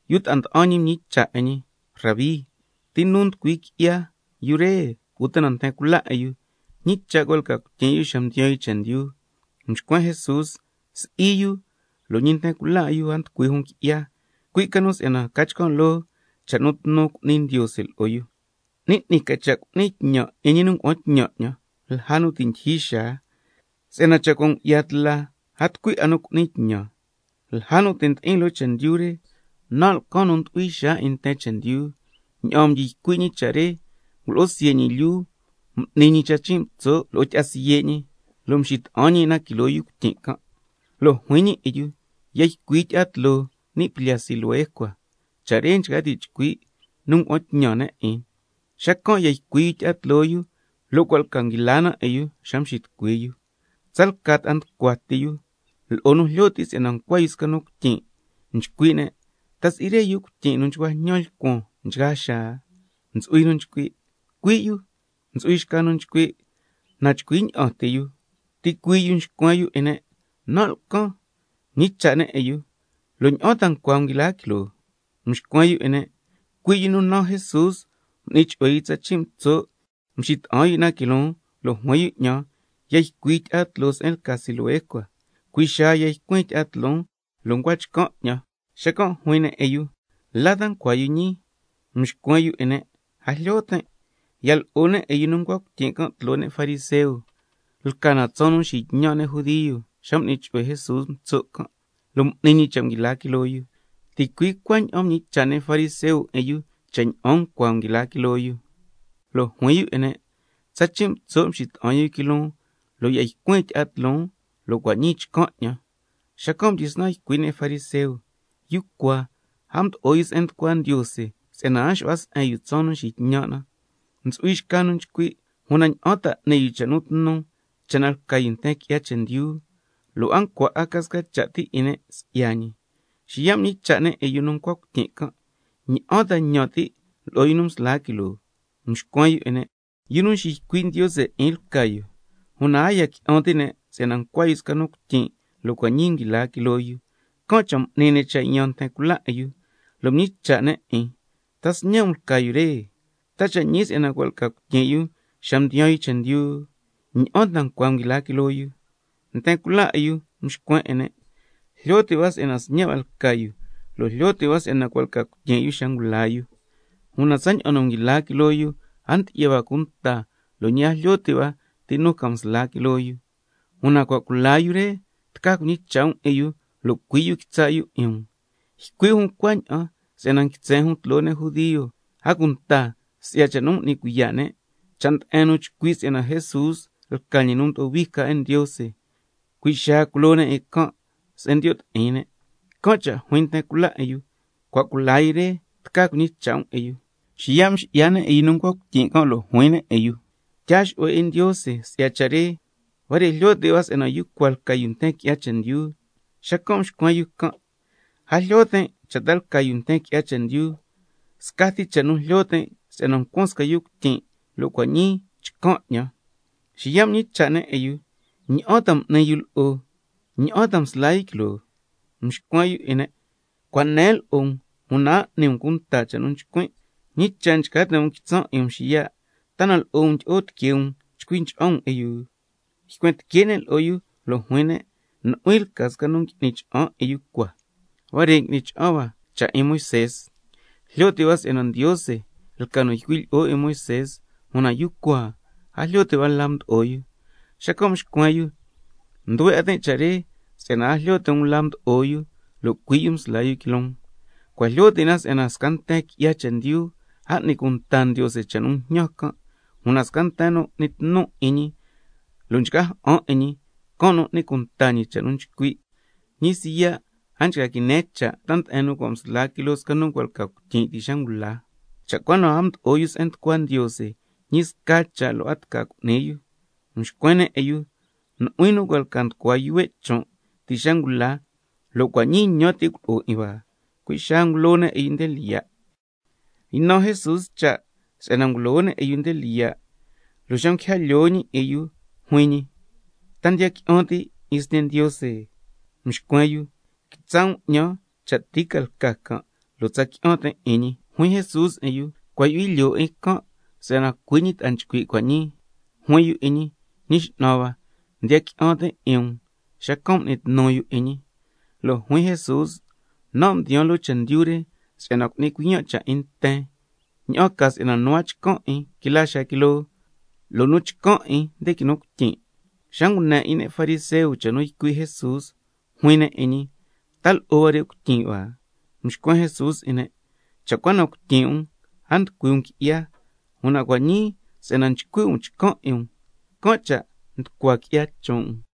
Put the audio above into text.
Yu ta'a nda'an ñi mñicha' 'in ñi: Rabí, ¿ti nu nducui qui'ya, yu re uta na nten cula 'in yu, ñi cha' cua' lca cuityin' yu xa mdiyaan yu chendyu? Xacan' mxcuen Jesús: Si'i yu, lo' ñi nten cula 'in yu a nducui jun qui'ya, cui' ca nu si'yana ca chcan' loo cha' nu tnu cu'ni Ndiose lo'o yu. 'Ni 'ni ca cha' cu'nin tñan 'in ñi nu ngua'an tñan 'ñan lja nu ti' ndyijyi xaa, si'yana cha' cua' ngu'ya tla a tucui 'a nu cu'ni tñan. Lja nu ti' ndi'in loo chendyu re, nan' lcan nu ndu'hui xaa 'in nten chendyu. Ña'aan mdyi ycui' ñi cha' re ngulo'o siye' ñi lyuu, m'ni ñi tsachin' mtso' lo'o tyi'a siye' ñi, lo' mxita'an ñi 'in na quiloo yu cuityin' can', lo' juin ñi 'in yu: Ya ycui tyi'a tloo ni' plyaa Siloé cua, (cha' re nchca ti' chcui': Nu ngua'an tñan ne' 'in). Xacan' ya ycui yu tyi'a tloo yu, lo' cua' lca nguila na 'in yu xa mxitucui yu. Tsalca ta'a nducua ti yu, lo'o nu jlyo ti' si'yana ncua yu sca nu cuityin', nchcui' ne': ¿Ta si'i re yu cuityin' nu nchcua njñan lcuan nchgaa xaa? Ntsu'hui nu nchcui': Cui' yu. Ntsu'hui xca nu nchcui': Na chcui ña'an ti yu. Ticuii' yu mxcuen yu 'in ne': Nan' lcan. Mñicha' ne' 'in yu: ¿Lo' ña'an ta ncua nguila quiloo? Mxcuen yu 'in ne': Cui' yu nu naan Jesús m'ni chu'hue yu tsachin' mtso', mxita'an yu 'in na quiloon, lo' juin yu 'ñan: Ya ycui tyi'a tloo se'en lca Siloé cua. Cui' xaa ya ycuin tyi'a tloon, lo' ncua chcan' 'ñan. Xacan' juin ne' 'in yu: ¿La ta ncua yu ñii? Mxcuen yu 'in ne': A jlyo tin'. Ya lo'o ne' 'in yu nu ncua cuityin' can' tloo ne' fariseo. Lca na tsaan nu nxitñan' ne' judio xa m'ni chu'hue Jesús mtso' can', lo' m'ni ñi cha' nguila quiloo yu. Ticui' cuaña'an mñicha' ne' fariseo 'in yu cha' ña'an ncua nguila quiloo yu. Lo' juin yu 'in ne': Tsachin' mtso' mxita'an yu quiloon, mjyi'an 'in na, lo' cua' ñii chcan' 'ñan. Xacan' mdyisnan ycui' ne' fariseo: Yu cua a mdo'o yu se'en nducua Ndiose si'yana a nxu'hua se'en yu tsaan nu nxitñan' na. Ntsu'hui xca nu nchcui': ¿Una ña'an ta n'ni yu cha' nu tnu cha' na lca yu nten qui'ya chendyu? Lo' a ncua 'a ca sca cha' ti 'in ne' si'ya ñi. Xiya' mñicha' ne' 'in yu nu ncua cuityin' can': ¿Ña'an ta ñan ti' lo'o yu nu msla quiloo? Mxcuen yu 'in ne': Yu nu nxiycui' Ndiose 'in lca yu. Una a ya qui'an ti' ne' si'yana ncua yu sca nu cuityin' lo' cua' ñii nguila quiloo yu. Can' cha' m'ni ne' cha' yaan nten cula 'in yu, lo' mñicha' ne' 'in: ¿Ta sñe' um lca yu re? ¿Ta cha' ñi si'yana cua' lca cuityin' yu xa mdiyaan yu chendyu? ¿Ña'an ta ncua nguila quiloo yu? Nten cula 'in yu mxcuen 'in ne': Jlyo ti' hua si'yana sñe' hua lca yu, lo' jlyo ti' hua si'yana cua' lca cuityin' yu xa ngula yu, una tsaña'an nguila quiloo yu, a ndyi'ya hua cunta lo' ñi a jlyo ti' hua ti ca nu msla quiloo yu, una cua' cula yu re, tca cuñicha' um 'in yu, lo' cui' yu quitsa' yu 'in um. Ycui' jun cuaña'an si'yana nguitsen jun tloo ne' judio, si'yana cua' m'ni cuiya' ne' cha', cha' nde'en nu chcui' si'yana Jesús lca ñi nu mdo'o hui ca 'in Ndiose, cui' xaa culo ne' 'in can' se'en ndiyo' ti'in ne'. Can' cha' juin nten cula 'in yu: Cua' cula yu re, tca cuñicha' um 'in yu. Xiya' mxi'ya ne' 'in yu nu ncua cuityin' can' lo' juin ne' 'in yu: Tyaa xu'hue 'in Ndiose si'ya cha' re, huare' jlyo ti' hua si'yana yu cua lca yu nten qui'ya chendyu. Xacan' mxcuen yu can': A jlyo tin' cha' ta lca yu nten qui'ya chendyu, scati cha' nu jlyo tin' si'yana ncuan sca yu cuityin' lo' cua' ñii chcan' 'ñan. Xiya' mñicha' ne' 'in yu: ¿Ña'an ta m'ni yu lo'o? ¿Ña'an ta msla yu quiloo? Mxcuen yu 'in ne': Cua' nen lo'o um, una a n'ni cunta um cha' nu nchcuin'. ¿Ñi cha' ta nchca ti' um quitsan' 'in um xiya', ta na lo'o um ndyi'o tiquee um chcui cha'an um 'in yu? Xacan' ycuen tique' ne' lo'o yu lo' juin ne': Nu'huin lca nu ngui'ni cha'an 'in yu cua, una huare' ngui'ni cha'an hua cha' 'in Moisé. Jlyo ti' hua si'yana Ndiose lca nu ycui' lo'o Moisé, una yu cua a jlyo ti' hua la mdo'o yu. Xacan' mxcuen yu: Nduhue 'a tin' cha' re, si'yana a jlyo ti' um la mdo'o yu, una cui' yu msla yu quiloon. Cua' jlyo ti' na si'yana sca nten qui'ya chendyu a n'ni cunta Ndiose cha' nu njñan can', una sca nten nu n'ni tnu 'in ñi lo' nchca ja'an 'in ñi, can' nu n'ni cunta ñi cha' nu nchcui'. Ñi siya' a nchca quine cha' ta nde'en nu cua' msla quiloo sca nu cua' lca cuityin' ti' xa ngula. Cha' cua na a mdo'o yu se'en nducua Ndiose, ñi sca cha' lo' a tca cu'ni yu. Mxcuen ne' 'in yu: Nu'huin nu cua' lca nducua qui'ya chon' ti' xa ngula, ¿lo' cua' ñii ñan ti' culo'o 'in hua? Cui' xaa ngulo ne' 'in yu nde lyiya'. Ynan Jesús cha' si'yana cua' ngulo ne' 'in yu nde lyiya', lo' xa nguija lyoo ñi 'in yu juin ñi: ¿Ta ndiya qui'an ti' 'in Sñe' Ndiose? Mxcuen yu can': Quitsa' um 'ñan cha' ti ca lca can', lo' tsa qui'an tin' 'in ñi. Juin Jesús 'in yu: Cua' ndyu'hui lyoo 'in can', si'yana cui' ñi ta'a nchcui' cua' ñii. Juin yu 'in ñi: Ñi X'nan hua, ndiya qui'an tin' 'in um, xacan' m'ni tnu yu 'in ñi. Lo' juin Jesús: Nan' mdiyaan loo chendyu re si'yana cu'nin cuiyan' cha' 'in nten, ña'an ca si'yana nu a chcan' 'in, quila xaa quiloo, lo' nu chcan' 'in, nde quinu cuityin'. Xa ngune 'in ne' fariseo cha' nu ycui' Jesús, juin ne' 'in ñi: ¿Ta lo'o huare' cuityin' hua? Xacan' mxcuen Jesús 'in ne': Cha' cua na cuityin' um a nducui um qui'ya, una cua' ñii si'yana nchcui' um chcan' 'in um, can' cha' nducua qui'ya chon' um.